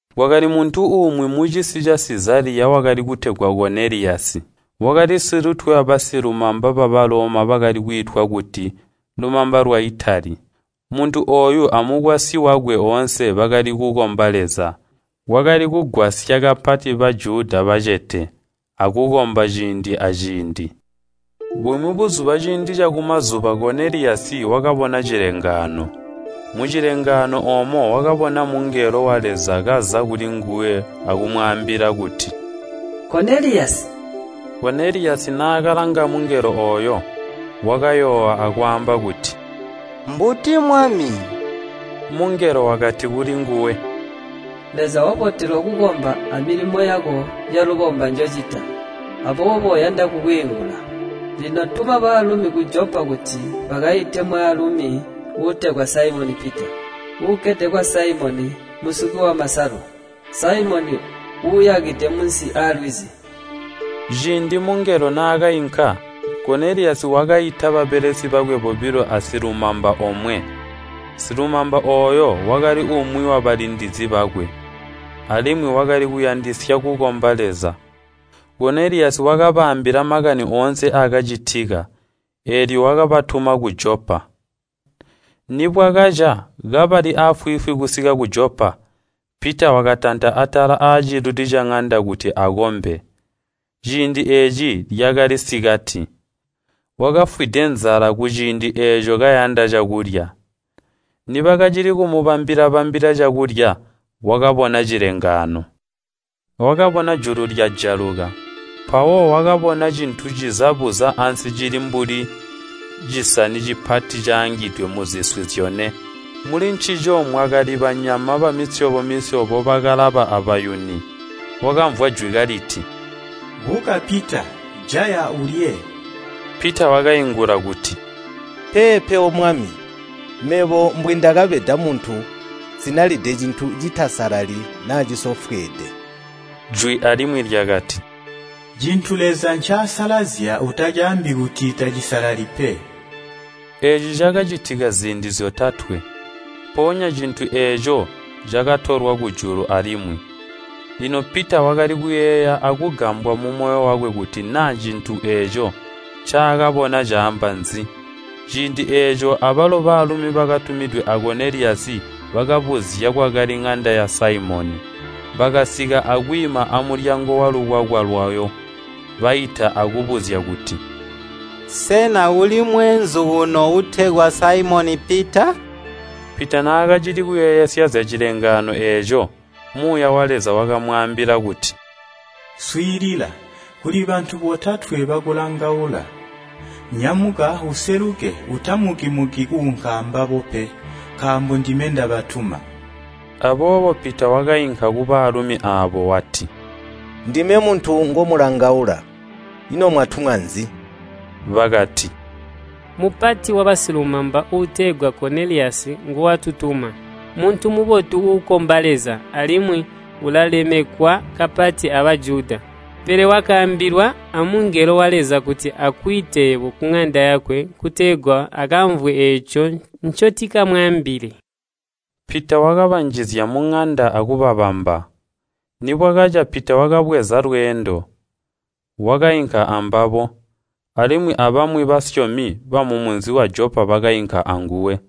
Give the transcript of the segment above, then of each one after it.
Kwakali muntu umwi mucisi ca Sizaliya wakali kutegwa Koneliyasi. Wakali mupati wankamu yabasilumamba ba Baloma yakali kwiitwa kuti “Lumamba lwa Itali.” Muntu ooyu amukwasyi wakwe oonse bakali kukomba Leza. Wakali kugwasya kapati Bajuda bacete, akukomba ciindi aaciindi. Bumwi buzuba ciindi cakumazuba Koneliyasi wakabona cilengaano. Mucilengaano oomo wakabona mungelo wa Leza kaza kulinguwe akumwaambila kuti, “Koneliyasi!” Koneliyasi naakalanga mungelo ooyo, wakayoowa akwaamba kuti, “Mbuti, Mwami?” Mungelo wakati kulinguwe, “Leza wabotelwa kukomba amilimo yako yalubomba njocita, aboobo uyanda kukwiingula. Lino tuma baalumi ku Jopa kuti bakaite mwaalumi uutegwa Saimoni Pita. Ukkede kwa Saimoni musuki wamasalu. Saimoni uuyakide munsi aalwizi.” Ciindi mungelo naakainka, Koneliyasi wakaita babelesi bakwe bobilo asilumamba omwe. Silumamba ooyo wakali umwi wabalindizi bakwe, alimwi wakali kuyandisya kukomba Leza. Koneliyasi wakabaambila makani oonse aakacitika, eelyo wakabatuma ku Jopa. Nibwakaca kabali aafwiifwi kusika ku Jopa, Pita wakatanta atala aaciluli caŋanda kuti akombe. Ciindi eeci lyakali sikati. Wakafwide nzala kuciindi eeco kayanda cakulya. Nibakacili kumubambila-bambila cakulya, wakabona cilengaano. Wakabona julu lyajaluka, mpawo wakabona cintu ciza buza ansi cili mbuli cisani cipati caangidwe muziswi zyone. Mulincico mwakali banyama bamisyobo-misyobo bakalaba abayuni. Wakamvwa jwi kaliti, “Buka Pita, jaya ulye!” Pita wakaingula kuti, “Peepe, O Mwami! Mebo mbwindakabeda muntu, nsinalide cintu citasalali naa cisofweede.” Jwi alimwi lyakati, “Cintu Leza ncaasalazya utacaambi kuti t acisalali pe.” Eeci cakacitika ziindi zyotatwe, mpoonya cintu eeco cakatolwa kujulu alimwi. Lino Pita wakali kuyeeya akugambwa mumoyo wakwe kuti naa cintu eeco ncaakabona caamba nzi. Ciindi eeco abalo baalumi bakatumidwe a Koneliyasi bakabuzya kwakali ŋanda ya Saimoni, bakasika akwiima amulyango walukwakwa lwayo. Baita akubuzya kuti, “Sena kuli mweenzu kuno uutegwa Saimoni Pita?” Pita naakacili kuyeeyesya zyacilengaano eeco, Muuya wa Leza wakamwaambila kuti, “Swiilila! Kuli bantu botatwe bakulangaula. Nyamuka useluke, utamuki-muki kuunka ambabo pe, nkaambo ndime ndabatuma.” Aboobo Pita wakainka kubaalumi aabo wati, “Ndime muntu ngomulangaula. Ino mwatumwa nzi?” Bakati, “Mupati wabasilumamba uutegwa Koneliyasi, nguwatutuma. Muntu mubotu uukomba Leza, alimwi ulalemekwa kapati a Bajuda. Pele wakaambilwa amungelo wa Leza kuti akwiite yebo kuŋanda yakwe kutegwa akamvwe eeco ncotikamwaambile.” Pita wakabanjizya muŋanda akubabamba. Nibwakaca Pita wakabweza lweendo, wakainka ambabo, alimwi abamwi basyomi bamumunzi wa Jopa bakainka anguwe.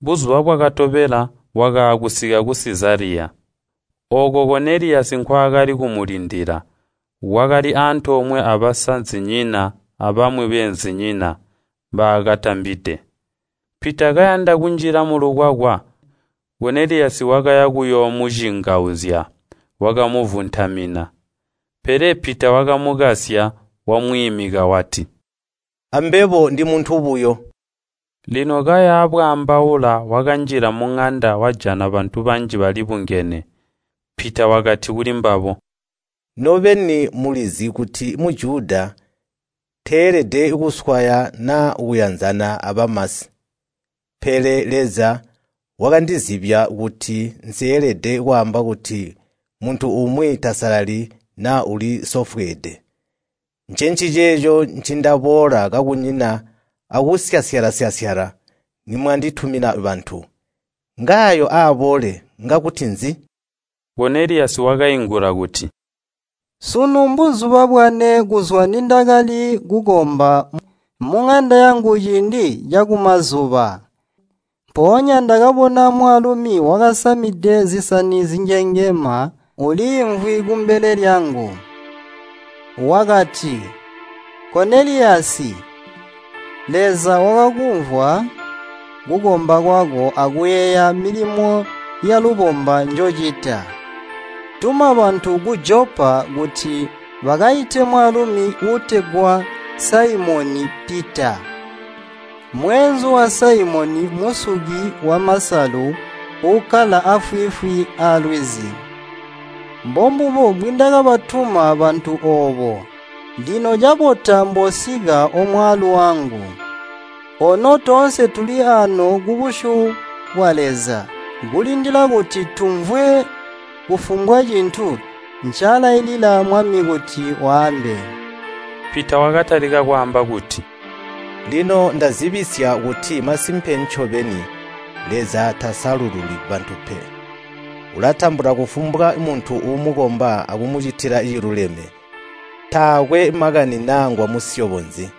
Buzuba bwakatobela wakaakusika ku Sizaliya. Ooko Koneliyasi nkwaakali kumulindila, wakali antoomwe abasazinyina abamwi beenzinyina mbaakatambide. Pita kayanda kunjila mulukwakwa Koneliyasi wakaya kuyoomucingauzya, wakamuvuntamina. Pele Pita wakamukasya, wamwiimika wati, “Ambebo ndi muntu buyo.” Lino kaya bwaambaula wakanjila muŋanda wajana bantu banji balibungene. Pita wakati kulimbabo, “Nobeni mulizi kuti Mujuda teelede kuswaya naa kuyanzana abamasi. Pele Leza wakandizibya kuti nseelede kwaamba kuti muntu umwi tasalali naa ulisofweede. Ncenciceeco ncindaboola kakunyina akusyasyala-syasyala nimwanditumina bantu. Ngaayo aaboole ngakuti nzi?” Koneliyasi wakaingula kuti, “Sunu mbuzuba bwane kuzwa nindakali kukomba muŋanda yangu ciindi cakumazuba. Mpoonya ndakabona mwaalumi wakasamide zisani zinyengema uliimvwi kumbele lyangu. Wakati, ‘Koneliyasi! Leza wakakumvwa kukomba kwako akuyeeya milimo yalubomba njocita. Tuma bantu ku Jopa kuti bakaite mwaalumi uutegwa Saimoni Pita, mweenzu wa Saimoni musuki wamasalu uukkala aafwiifwi alwizi.’ Mbombubo mbwindakabatuma bantu oobo, lino cabota mboosika omwaalu wangu. Ono toonse tuli aano kubusyu bwa Leza kulindila kuti tumvwe kufumbwa cintu ncaalailila Mwami kuti waambe.” Pita wakatalika kwaamba kuti, “Lino ndazibisya kuti masimpe ncobeni Leza tasalululi bantu pe. Ulatambula kufumbwa muntu uumukomba akumucitila ciluleme, taakwe makani naa ngwamusyobo nzi.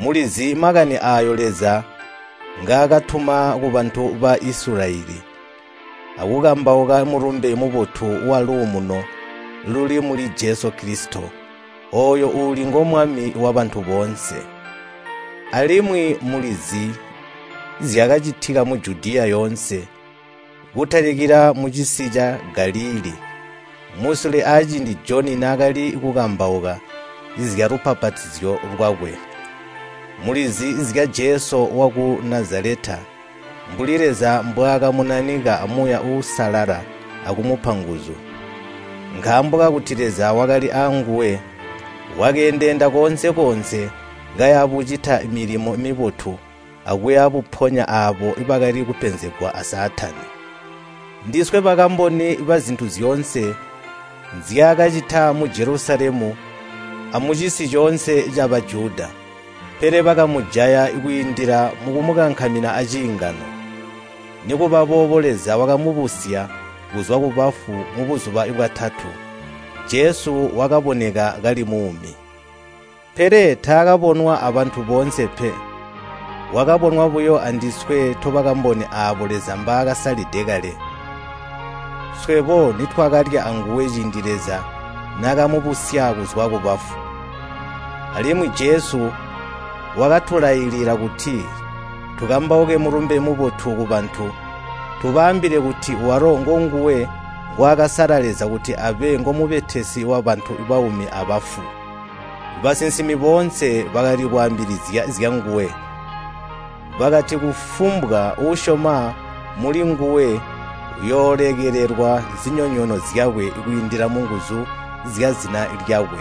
Mulizi makani aayo Leza ngaakatuma kubantu ba Isilayeli, aakukambauka Mulumbe Mubotu waluumuno luli muli Jesu Kilisito, ooyo uuli ngo Mwami wabantu boonse. Alimwi mulizi zyakacitika mu Judiya yoonse, kutalikila mucisi ca Galilii, musule aciindi Joni naakali kukambauka zyalubbapatizyo lwakwe. Mulizi zya Jesu waku Nazaleta, mbuli Leza mbwaakamunanika a Muuya Uusalala akumupa nguzu. Nkaambo kakuti Leza wakali aanguwe, wakeendeenda koonse-koonse kaya bucita milimo mibotu akuya buponya aabo bakali kupenzegwa a Saatani. Ndiswe bakamboni bazintu zyoonse nzyaakacita mu Jelusalemi amucisi coonse ca Bajuda. Pele bakamujaya kwiindila mukumukankamina aciingano. Nikubaboobo Leza wakamubusya kuzwa kubafu mubuzuba bwatatu, Jesu wakaboneka kali muumi. Pele taakabonwa abantu boonse pe, wakabonwa buyo andiswe tobakamboni aabo Leza mbaakasalide kale. Swebo nitwakalya anguwe ciindi Leza naakamubusya kuzwa kubafu. Alimwi Jesu wakatulailila kuti tukambauke Mulumbe Mubotu kubantu, tubaambile kuti walo ngonguwe ngwaakasala Leza kuti abe ngomubetesi wabantu baumi abafu. Basinsimi boonse bakali kwaambilizya zyanguwe, bakati kufumbwa uusyoma mulinguwe uyoolekelelwa zinyonyoono zyakwe kwiindila munguzu zyazina lyakwe.”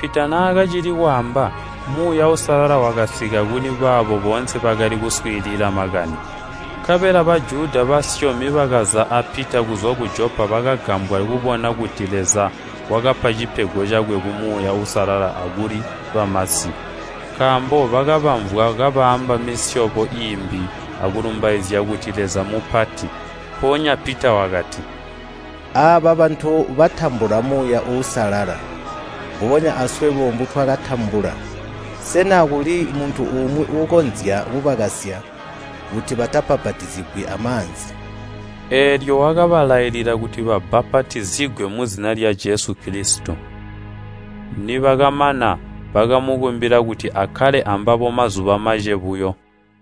Pita naakacili kwaamba, Muuya Uusalala wakasika kuli baabo boonse bakali kuswiilila makani. Nkabela Bajuda basyomi bakaza a Pita kuzwa ku Jopa bakagambwa kubona kuti Leza wakapa cipego cakwe ca Muuya Uusalala akuli bamasi. Nkaambo bakabamvwa kabaamba misyobo iimbi akulumbaizya kuti Leza mupati. Mpoonya Pita wakati, “Aaba bantu batambula Muuya Uusalala mbubonya aswebo mbutwakatambula. Sena kuli muntu umwi uukonzya kubakasya kuti batabbapatizigwi amaanzi?” Eelyo wakabalailila kuti babbapatizigwe muzina lya Jesu Kilisito. Nibakamana, bakamukumbila kuti akkale ambabo mazuba mace buyo.